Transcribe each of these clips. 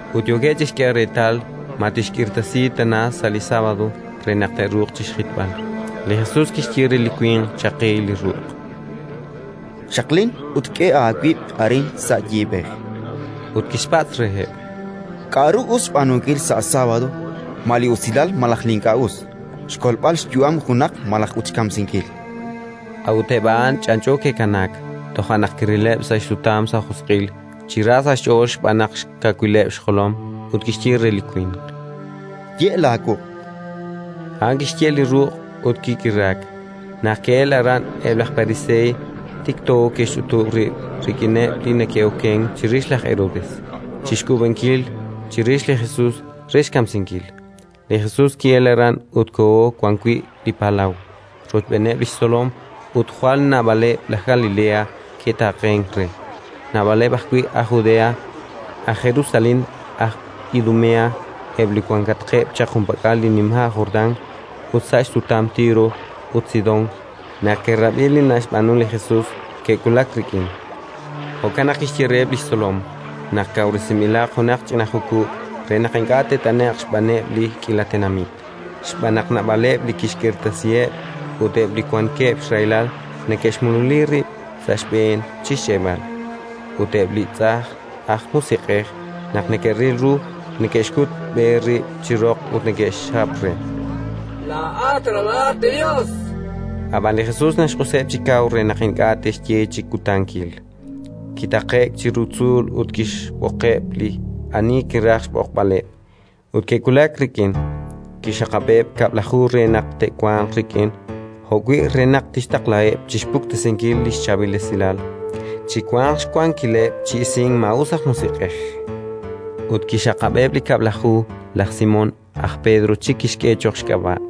Ut yookeb' chi xk'eeb'al reetal ma tixk'irtasi tana sa' li sábado re naq te'ruuq xjitb'al. Li Jesus kixye re li winq chaqi li ruq': —Xaqlin ut k'e aawib' arin sa' yiib'ej. Ut kixpatz' reheb': —K'aru us xb'aanunkil sa' sábado, ma li usilal malaj li ink'a' us, xkolb'al xyu'am junaq malaj ut xkamsinkil? A'ut eb' a'an ch'anch'o ke'kanaak. Toja' naq kirileb' sa' xsutam sa' josq'il, chi ra sa' xch'ool xb'aan xkawileb' xjolom, ut kixye re li winq: —Ye' laawuq'. A'an kixye' li ruq' ut kik'iraak. Naq ke'elk aran eb' laj Pariseey, tikto ke'xch'utub' rib' rik'ineb' li neke'okenk chirix laj Herodes, chi k'uub'ank chirix li Jesus re xkamsinkil. Li Jesus ki'elk aran ut koho wan wi' li palaw, rochb'eeneb' li xtzolom, ut jwal naab'aleb' aj Galilea ke'taaqenk re. Naab'aleb' ajwi' aj Judea, aj Jerusalén, aj Idumea, eb' li wankatqeb' chaq junpak'al li nima' Jordán ut sa' xsutam Tiro ut Sidón, naq ke'rab'i li naxb'aanu li Jesus, ke'wulak rik'in. Jo'kan naq kixye reheb' li xtzolom naq kawresinb'ilaq junaq ch'ina jukub' re naq ink'a' taanat'e'q xb'aaneb' li k'iila tenamit: xb'aan naq naab'aleb' li kixk'irtasiheb', ut eb' li wankeb' xrahilal neke'xmululi rib' sa' xb'een chi xch'e'b'al. Ut eb' li tz'ajn aj musiq'ej, naq neke'ril ru, neke'xkutb'e rib' chi roq ut neke'xjap re: “Laa'at Ralalat li Yos”, chankeb'. Ab'an li Jesus naxq'useb' chi kaw re naq ink'a' te'xye chi kutankil. Kitaqe'k chiru tzuul ut kixb'oqeb' li ani kiraj xb'oqb'aleb', ut ke'wulak rik'in. Kixxaqab'eb' Kab'laju re naq te'wanq rik'in, jo'wi' re naq tixtaqlaheb' chi xpuktesinkil li Chaab'il Esilal, chi wanq xwankileb' chi isink maa'us aj musiq'ej. Ut kixxaqab'eb' li Kab'laju: laj Simón, aj Pedro chik kixk'e cho'q xk'ab'a';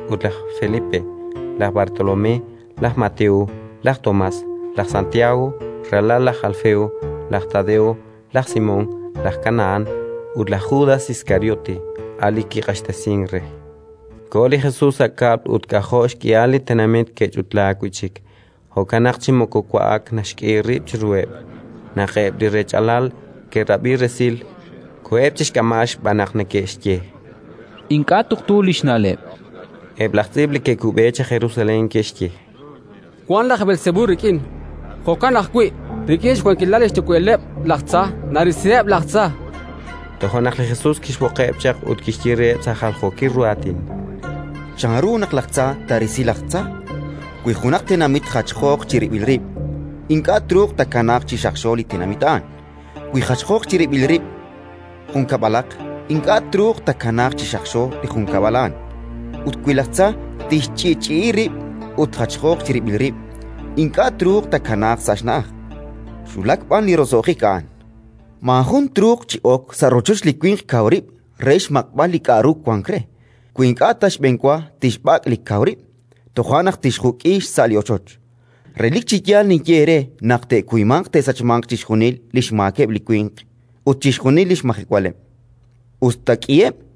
laj Andrés ut laj Felipe, laj Bartolomé, laj Mateo, laj Tomás, laj Santiago, ralal laj Alfeo, laj Tadeo, laj Simón aj Kanahán ut laj Judas Iskariote, a' li kiq'axtesink re. Koho li Jesus sa' kab'l ut k'ajo' xk'ihal li tenamit ke'ch'utlaak wi' chik: jo'kan naq chi moko wa'ak naxk'e rib' chiruheb'. Naq eb' li rech'alal ke'rab'i resil, koheb' chi xk'amb'al, xb'aan naq neke'xye: “Ink'a' tuqtu li xna'leb'”. Eb' laj tz'iib' li ke'kub'e chaq Jerusalén ke'xye: “Wank laj Beelsebul rik'in”. Jo'kan ajwi': “Rik'in xwankilal li xyuwa'ileb' laj tza narisiheb' laj tza”, chankeb' re. Toja' naq li Jesus kixb'oqeb' chaq ut kixye reheb' sa' jaljookil ru aatin: “Chanru naq laj tza taarisi laj tza? Wi junaq tenamit jachjooq chirib'il rib', ink'a' truuq taakanaaq chi xaqxo li tenamit a'an. Wi jachjooq chirib'il rib' jun kab'alaq, ink'a' truuq taakanaaq chi xaqxo li junkab'al a'an. Ut wi laj tza tixch'i'ch'i'i rib' ut jachjooq chirib'il rib', ink'a' truuq taakanaaq sa' xna'aj, xwulak b'an li roso'jik a'an. “Maajun truuq chi ok sa' rochoch li winq kaw rib' re xmaq'b'al li k'aru wank re, wi ink'a' ta xb'enwa tixb'ak' li kaw rib'; toja' naq tixjuk'i xsa' li rochoch. “Relik chi yaal ninye eere naq te'kuymanq te'sachmanq chixjunil li xmaakeb' li winq ut chixjunil li xmajewaleb', us ta k'iheb';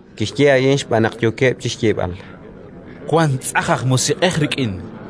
Kixye a'in xb'aan naq yookeb' chi xyeeb'al: “Wank tz'ajn aj musiq'ej rik'in”.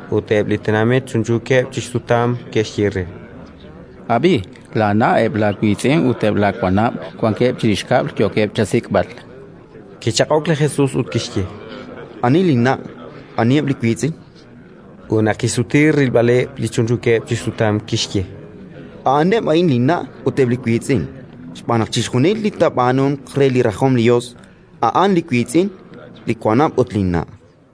Ut eb' li tenamit chunchuukeb' chi xsutam, ke'xye re: —Ab'i, laana', eb' laawiitz'in ut eb' laawanab' wankeb' chirix kab'l, yookeb' chasik'b'al. Kichaq'ok li Jesus ut kixye: —Ani linna', aniheb' li wiitz'in? Ut naq kixsuti rilb'aleb' li chunchuukeb' chi xsutam, kixye: —A'aneb' a'in linna' ut eb' li wiitz'in. Xb'aan naq chixjunil li taab'aanunq re li rajom li Yos, a'an li wiitz'in, li wanab' ut linna'.